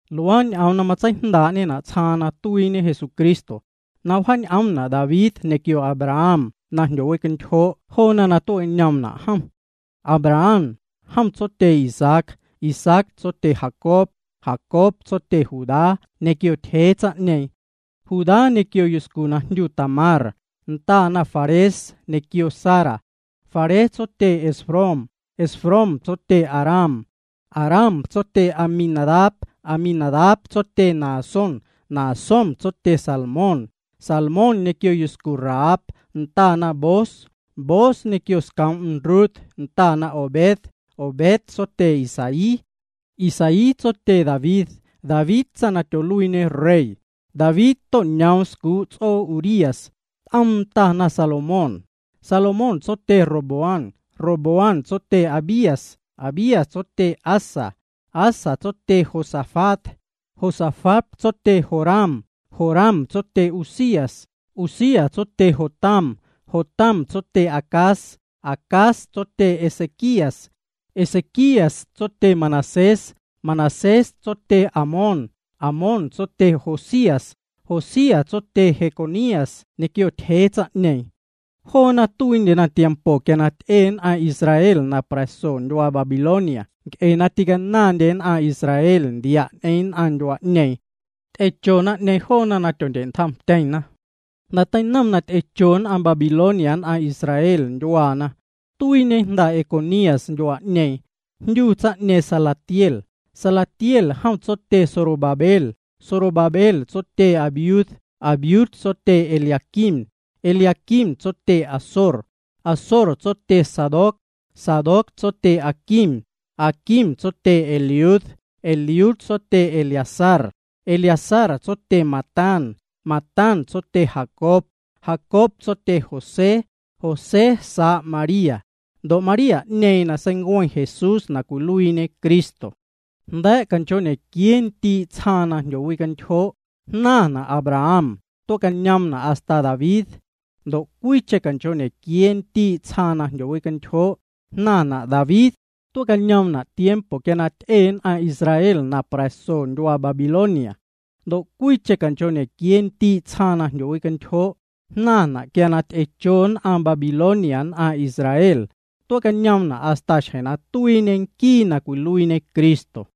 Luaa ñ'oom na matseijndaa'ñena' tsjaaⁿ nn'aⁿ na tuiiñe Jesucristo, na wjaac'oomna' David ñequio Abraham na jndyowicantyjoo' joona na tue'cañoomna' jom. Abraham, jom tsotye Isaac, Isaac tsotye Jacob, Jacob tsotye Judá ñequio ntyjee tsaⁿ'ñeeⁿ. Judá ñequio yuscu na jndyu Tamar, ndana Fares ñequio Zara. Fares tsotye Esrom, Esrom tsotye Aram. Aram tsotye Aminadab, Aminadab tsotye Naasón, Naasón tsotye Salmón. Salmón ñequio yuscu Rahab, ndana Booz, Booz ñequio scoom'm Rut, ndana Obed, Obed tsotye Isaí. Isaí tsotye David tsaⁿ na tyoluiiñe rey, David to'ñoom scuu' ts'oo Urías, t'oom ndana Salomón. Salomón tsotye Roboam, Roboam tsotye Abías, Abías tsotye Asa. Asa tsotye Josafat, Josafat tsotye Joram, Joram tsotye Uzías. Uzías tsotye Jotam, Jotam tsotye Acaz, Acaz tsotye Ezequías. Ezequías tsotye Manasés, Manasés tsotye Amón, Amón tsotye Josías. Josías tsotye Jeconías ñequio ntyjee tsaⁿ'ñeeⁿ. Joona tuiindyena tiempo quia ty'e nn'aⁿ Israel na pra̱so ndyuaa Babilonia nc'e na ticanaⁿndye nn'aⁿ Israel ndia' ñ'eⁿ nn'aⁿ ndyuaa'ñeeⁿ. Ty'echo naⁿ'ñeeⁿ joona na tyondye'ntjomtyeⁿna. Jnda̱ teinom na ty'echo nn'aⁿ Babilonia nn'aⁿ Israel ndyuaana, tuiiñe jnda Jeconías ndyuaa'ñeeⁿ. Jndyu tsaⁿ'ñeeⁿ Salatiel, Salatiel jom tsotye Zorobabel. Zorobabel tsotye Abiud, Abiud tsotye Eliaquim, Eliaquim tsotye Azor. Azor tsotye Sadoc, Sadoc tsotye Aquim, Aquim tsotye Eliud. Eliud tsotye Eleazar, Eleazar tsotye Matán, Matán tsotye Jacob. Jacob tsotye José, José saa' María. Ndo' María'ñeeⁿ na seincueⁿ Jesús na cwiluiiñe Cristo. Jnda̱a̱' canchoo'ñequiee ndii' tsjaaⁿ na jndyowicantyjoo', jnaⁿna' Abraham, tue'cañoomna' hasta David. Ndo' cwiicheⁿ canchoo'ñequiee ndii' tsjaaⁿ na jndyowicantyjoo', jnaⁿna' David, tue'cañoomna' tiempo quia na ty'e nn'aⁿ Israel na pra̱so ndyuaa Babilonia. Ndo' cwiicheⁿ canchoo'ñequiee ndii' tsjaaⁿ na jndyowicantyjoo', jnaⁿna' quia ty'echo nn'aⁿ Babilonia nn'aⁿ Israel, tue'cañoomna' hasta xjeⁿ na tuiiñe nquii na cwiluiiñe Cristo.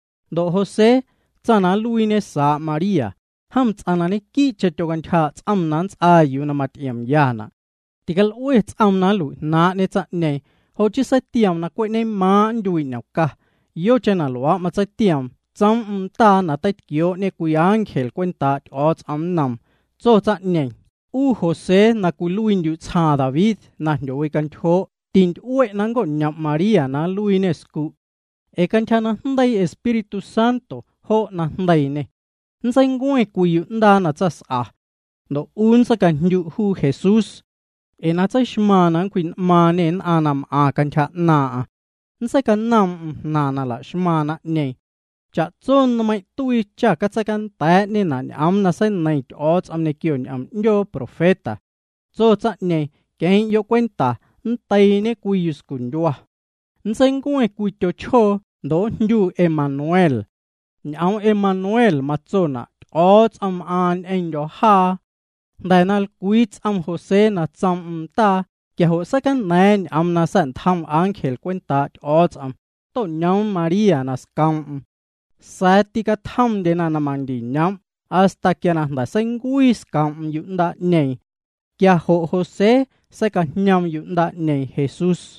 Ndo' José, tsaⁿ na nluiiñe saa' María, jom ts'aⁿ na ñequii'cheⁿ tyocantyjaa' ts'om na nts'aa yuu na maty'iomyana'. Tical'ue ts'oom na nlui'jnaaⁿ'ñe tsaⁿ'ñeeⁿ, jo' chii seitioom na cwe' ñemaaⁿ' nntyuii' ñomca. Yocheⁿ na luaa' matseitioom, tsoom'm ndaa na teitquioo'ñe cwii ángel cwentaa' Ty'o̱o̱ts'om nnoom. Tso tsaⁿ'ñeeⁿ: —'U José na cwiluiindyu' tsjaaⁿ David na jndyowicantyjoo' tinty'ue' na nnco'ñom' María na nluiiñê scu'. Ee cantyja najndeii Espíritu Santo jo' na jndeiiñê. Nntseincueⁿ cwii yu'ndaa na tsaⁿs'a. Ndo' 'u nntseicajndyu' juu Jesús. Ee na tseixmaaⁿ na nncwji'n'maaⁿñê nn'aⁿ na m'aⁿ cantyja 'naaⁿ'aⁿ. Nntseicanoom'm jnaⁿ na la'xmaⁿ naⁿ'ñeeⁿ. Cha'tso nmeiⁿ' tuii cha catseicanda̱a̱'ñena' ñ'oom na seineiⁿ Ty'o̱o̱ts'om ñequio ñ'oom 'ndyoo profeta. Tso tsaⁿ'ñeeⁿ: Queⁿ'yo' cwenta, nndeiiñe cwii yuscundyua. Nntseincueⁿ cwii tyochjoo ndo' njndyu Emanuel. Ñ'oom Emanuel matsona': Ty'o̱o̱ts'om m'aaⁿ ñ'eⁿndyo̱ jaa. Jnda̱ na lcwii ts'om José na tsoom'm ndaa, quia jo' seicana̱a̱ⁿ ñ'oom na sa̱'ntjom ángel cwentaa' Ty'o̱o̱ts'om, to'ñoom María na scoom'm. Sa̱a̱ ticatjomndyena na mandiñoom' hasta quia jnda̱ seincuii scoom'm yu'ndaa'ñeeⁿ. Quia jo' José seicajñoom yu'ndaa'ñeeⁿ Jesús.